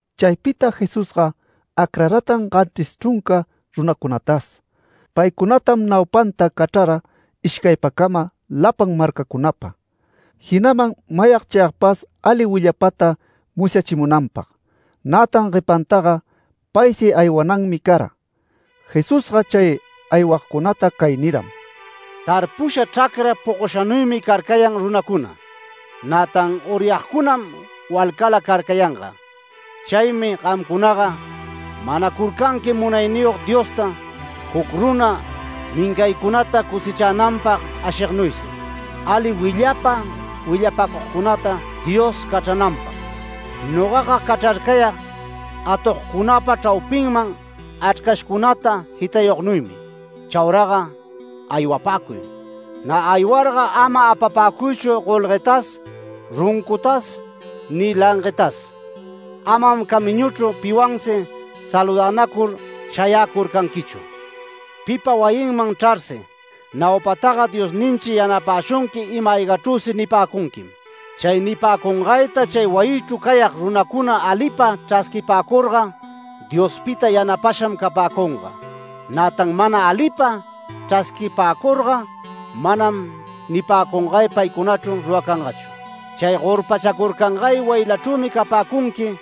Chaypita Jesusga acraratan ganchris chrunca runacunatas. Paycunatam naupanta cachrara ishcaypacama lapan marcacunapa, jinaman mayag chayagpas ali willapata musyachimunanpag, nätan guepantaga paysi aywananmi cara. Jesusga chay aywagcunata cay niram: “Tarpusha chracra pogoshanuymi carcayan runacuna, nätan uryagcunam walcala carcayanga. Chaymi gamcunaga manacurcanqui Munayniyog Diosta juc runa mincaycunata cosechananpag ashignuysi, ali willapa willapacugcunata Dios cachrananpag. Nogaga cachrarcayag atogcunapa chraupinman achrcashcunata jitayugnuymi. Chauraga aywapäcuy. Nä aywarga ama apapäcuychu golguetas runcutas ni languetas. Amam camiñuchru piwansi saludänacur shayäcurcanquichu. Pipa wayinman chrarsi, naupataga ‘Diosninchi yanapäshunqui ima-aygachrüsi’ nipäcunquim. Chay nipäcungayta chay wayichru cayag runacuna alipa chrasquipäcurga, Diospita yanapasham capäcunga. Nätan mana alipa chrasquipäcurga manam nipäcungay paycunachru ruracangachu. Chay gorpachacurcangay wayilachrümi capäcunqui,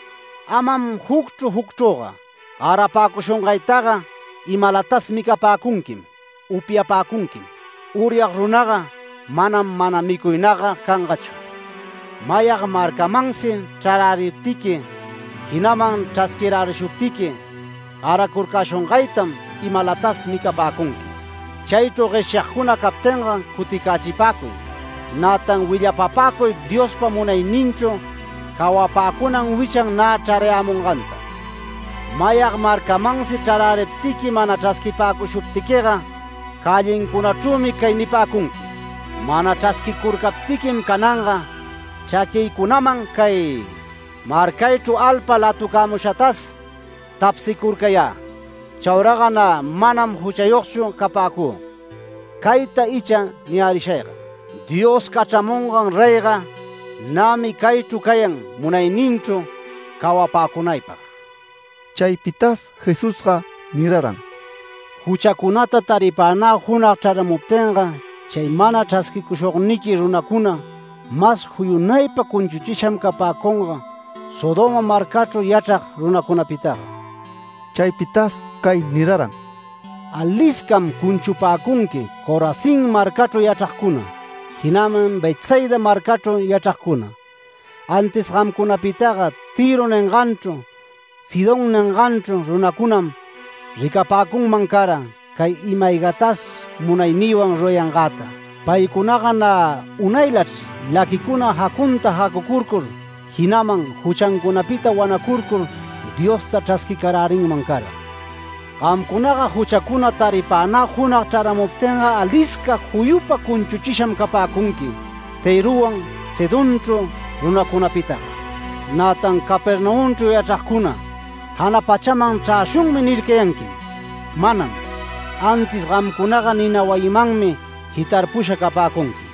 amam jucchru jucchrüga. Garapäcushungaytaga imalatas micapäcunquim, upyapäcunquim. Uryag runaga manam, mana micuynagga cangachu. Mayag marcamansi chraräriptiqui, jinaman chrasquirärishuptiqui. Garacurcäshungaytam imalatas micapäcunqui. Chaychru gueshyagcuna captinga cuticächipäcuy, nätan willapapäcuy Diospa munayninchru cawapäcunan wichan nä chrarayämunganta. Mayag marcamansi chraräriptiqui, mana chrasquipäcushuptiquiga cällincunachrümi cay nipäcunqui: ‘Mana chrasquicurcaptiquim cananga chraquïcunaman cay marcaychru alpa latucämushatas tapsicurcayä. Chauraga nä manam juchayogchu capäcü. Cayta icha niyärishayga: Dios cachramungan reyga nämi caychru cayan munayninchru cawapäcunaypag’”. Chaypitas Jesusga niraran: “Juchacunata taripänä junag chraramuptinga chay mana chrasquicushugniqui runacuna mas juyunaypa cunchuchisham capäcunga Sodoma marcachru yachrag runacunapitaga”. Chaypitas cay niraran: “Aliscam cunchupäcunqui Corazín marcachru yachragcuna, jinaman Betsaida marcachru yachragcuna. Antis gamcunapitaga Tïro ninganchru, Sidón ninganchru runacunam ricapäcunman cara, cay ima-aygatas munaynïwan rurayangäta. Paycunaga nä unaylachr laquicuna jacunta jacucurcur, jinaman juchancunapita wanacurcur Diosta chrasquicarärinman cara. Gamcunaga juchacuna taripänä junag chraramuptinga alisca juyupa cunchuchisham capäcunqui Tïrowan Sidonchru runacunapitaga. Nätan Capernaumchru yachragcuna, ‘Jana pachaman chräshunmi’ nircayanquim. Manam. Antis gamcunaga nina wayimanmi jitarpusha capäcunqui”.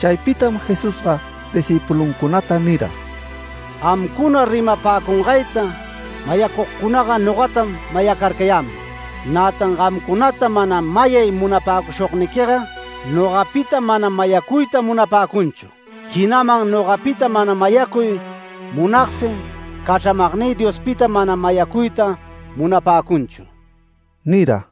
Chaypitam Jesusga discïpuluncunata nira: “Gamcuna rimapäcungayta mayacugcunaga nogatam mayacarcayäman. Nätan gamcunata mana mayay munapäcushugniquiga, nogapitam mana mayacuyta munapäcunchu, jinaman nogapita mana mayacuy munagsi, cachramagnï Diospitam mana mayacuyta munapäcunchu” nira.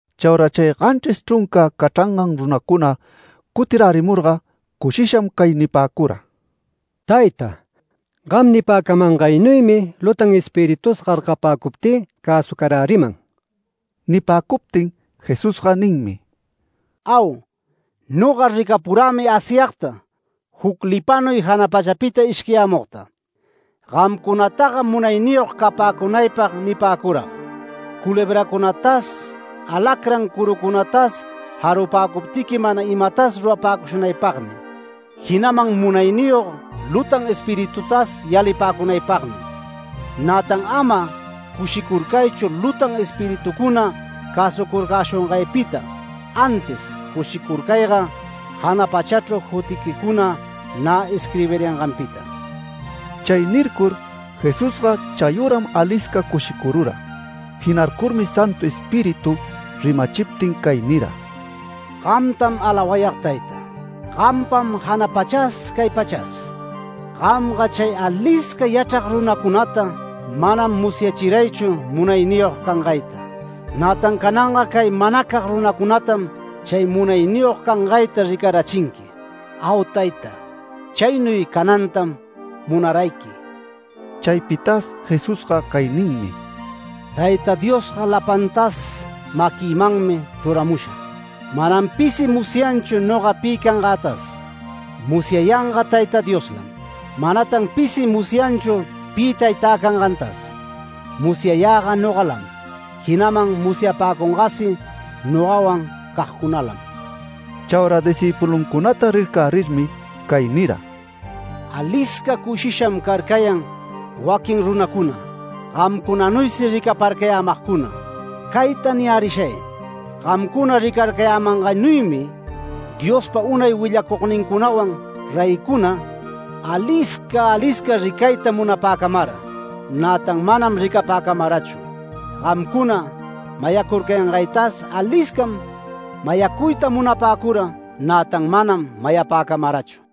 Chaura chay ganchris chrunca cachrangan runacuna cutirärimurga cushisham cay nipäcura: “Tayta, gam nipäcamangaynuymi lutan espiritus gargapäcuptï cäsucaräriman”. Nipäcuptin Jesusga ninmi: “¡Au! Noga ricapurämi Asyagta juc lipanuy jana pachapita ishquiyämugta. Gamcunataga munayniyog capäcunaypag nipäcurag: Culebracunatas, alacrán curucunatas jarupäcuptiqui mana imatas rurapäcushunaypagmi, jinaman munayniyog lutan espiritutas yalipäcunaypagmi. Nätan ama cushicurcaychu lutan espiritucuna cäsucurcäshungaypita, antis cushicurcayga jana pachachru jutiquicuna nä isquirbirayanganpita”. Chay nircur Jesusga chayüram alisca cushicurura. Jinarcurmi Santu Espíritu rimachiptin cay nira: “Gamtam alawayag Tayta. Gampam jana pachas, cay pachas. Gamga chay alisca yachrag runacunata manam musyachiraychu munayniyog cangayta. Nätan cananga cay manacag runacunatam chay munayniyog cangayta ricarachinqui. ¡Au Tayta! Chaynuy canantam munarayqui”. Chaypitas Jesusga cay ninmi: “Tayta Diosga lapantas maquïmanmi chruramusha. Manam pisi musyanchu noga pi cangätas. Musyayanga Tayta Dioslam. Manatan pisi musyanchu pi Taytä cangantas, musyayäga nogalam, jinaman musyapäcungasi nogawan cagcunalam”. Chaura discïpuluncunata rircärirmi cay nira: “Alisca cushisham carcayan waquin runacuna, gamcunanuysi ricaparcayämagcuna. Cayta niyärishay: Gamcuna ricarcayämangaynuymi, Diospa unay willacugnincunawan reycuna, alisca alisca ricayta munapäcamara, nätan manam ricapäcamarachu. Gamcuna mayacurcayangaytas aliscam mayacuyta munapäcura, nätan manam mayapäcamarachu”.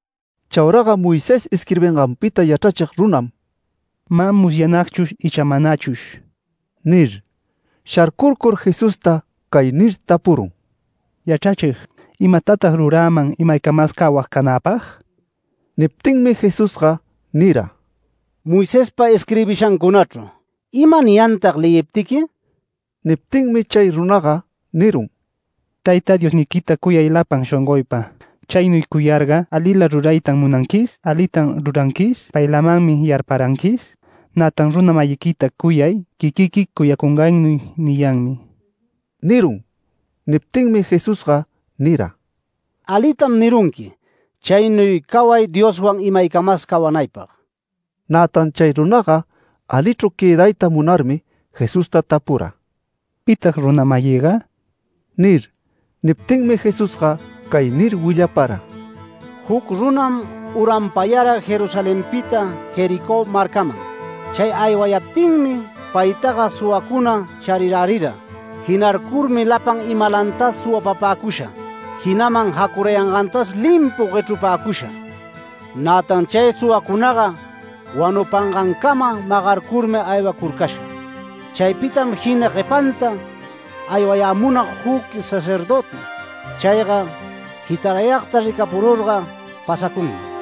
Chauraga Moisés isquirbinganpita yachrachig runam “¿Mä musyanagchush icha manachush?” nir. Sharcurcur Jesusta cay nir tapurun: “Yachrachig, ¿imatatag ruräman imaycamas cawag canäpag?” Niptinmi Jesusga nira: “Moisespa isquirbishancunachru ¿ima niyantag leyiptiqui?” Niptinmi chay runaga nirun: “ ‘Tayta Diosniquita cuyay lapan shongoypa. Chaynuy cuyarga alila ruraytam munanquis alitam ruranquis paylamanmi yarparanquis, nätan runa-mayiquita cuyay quiquiqui cuyacungaynuy’ niyanmi” nirun. Niptinmi Jesusga nira: “Alitam nirunqui chaynuy caway Dioswan imaycamas cawanaypag”. Nätan chay runaga alichru quëdayta munarmi, Jesusta tapura: “¿Pitag runa-mayïga?” nir. Niptinmi Jesusga cay nir willapara: “Juc runam uranpayara Jerusalenpita Jericó marcaman. Chay aywayaptinmi paytaga suwacuna charirärira. Jinarcurmi lapan imalantas suwapapäcusha, jinaman jacurayangantas limpun guechrupäcusha, nätan chay suwacunaga wanupangancama magarcurmi aywacurcasha. Chaypitam jina guepanta aywayämunag juc sacerdöti. Chayga jitarayagta ricaparurga pasacunmi.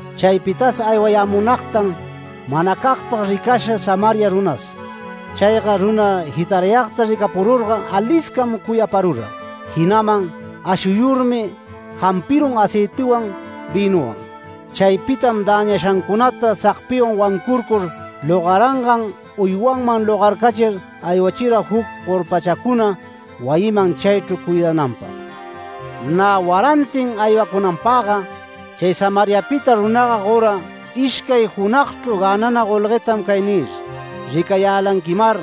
Chaypitas aywayämunagtan manacagpag ricasha Samaria runas. Chayga runa jitarayagta ricapururga aliscam cuyaparura. Jinaman ashuyurmi jampirun aceitiwan, vïnuwan. Chaypitam däñashancunata sagpiwan wancurcur logarangan uywanman logarcachir aywachira juc gorpachacuna wayiman chaychru cuidananpag. Nä warantin aywacunanpagga chay Samariapita runaga gora ishcay junagchru gänana golguetam cay nir: ‘Ricayälanquimar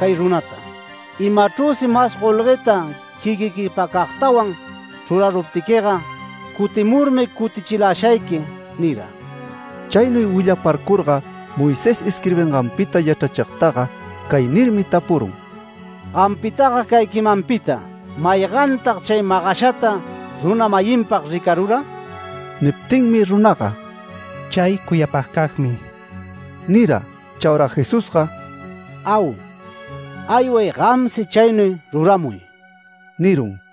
cay runata. Imachrüsi mas golgueta quiquiquipacagtawan chruraruptiquiga, cutimurmi cutichilashayqui’ nira”. Chaynuy willaparcurga Moisés isquirbinganpita yachrachigtaga cay nirmi tapurun: “Gampitaga cay quimanpita ¿maygantag chay magashata runa-mayinpag ricarura?” Niptinmi runaga “Chay cuyapagcagmi” nira. Chaura Jesusga “Au. Ayway gamsi chaynuy ruramuy” nirun.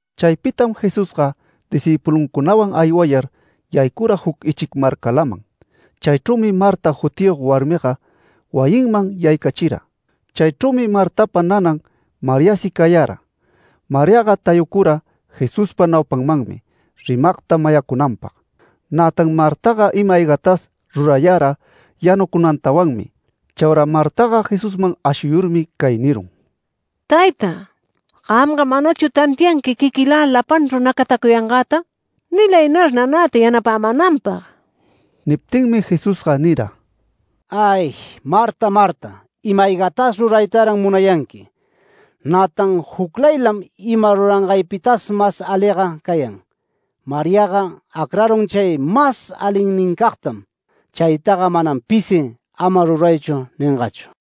Chaypitam Jesusga discïpuluncunawan aywayar yaycura juc ichic marcalaman. Chaychrümi Marta jutiyog warmiga wayinman yaycachira. Chaychrümi Martapa nanan Mariasi cayara. Mariaga tayucura Jesuspa naupanmanmi rimagta mayacunanpag. Nätan Martaga ima-aygatas rurayara yanucunantawanmi. Chaura Martataga Jesusman ashuyurmi cay nirun: “Tayta, ¿gamga manachu tantianqui quiquïla lapanchru nacatacuyangäta? Nilaynar nanäta yanapämänanpag”. Niptinmi Jesusga nira: “¡Ay Marta! Marta, ima-aygatas ruraytaran munayanqui. Nätan juclaylam ima rurayangaypitas mas aliga cayan. Mariaga acrarun chay mas alinnincagtam. Chaytaga manam pisi ama ruraychu ningachu”.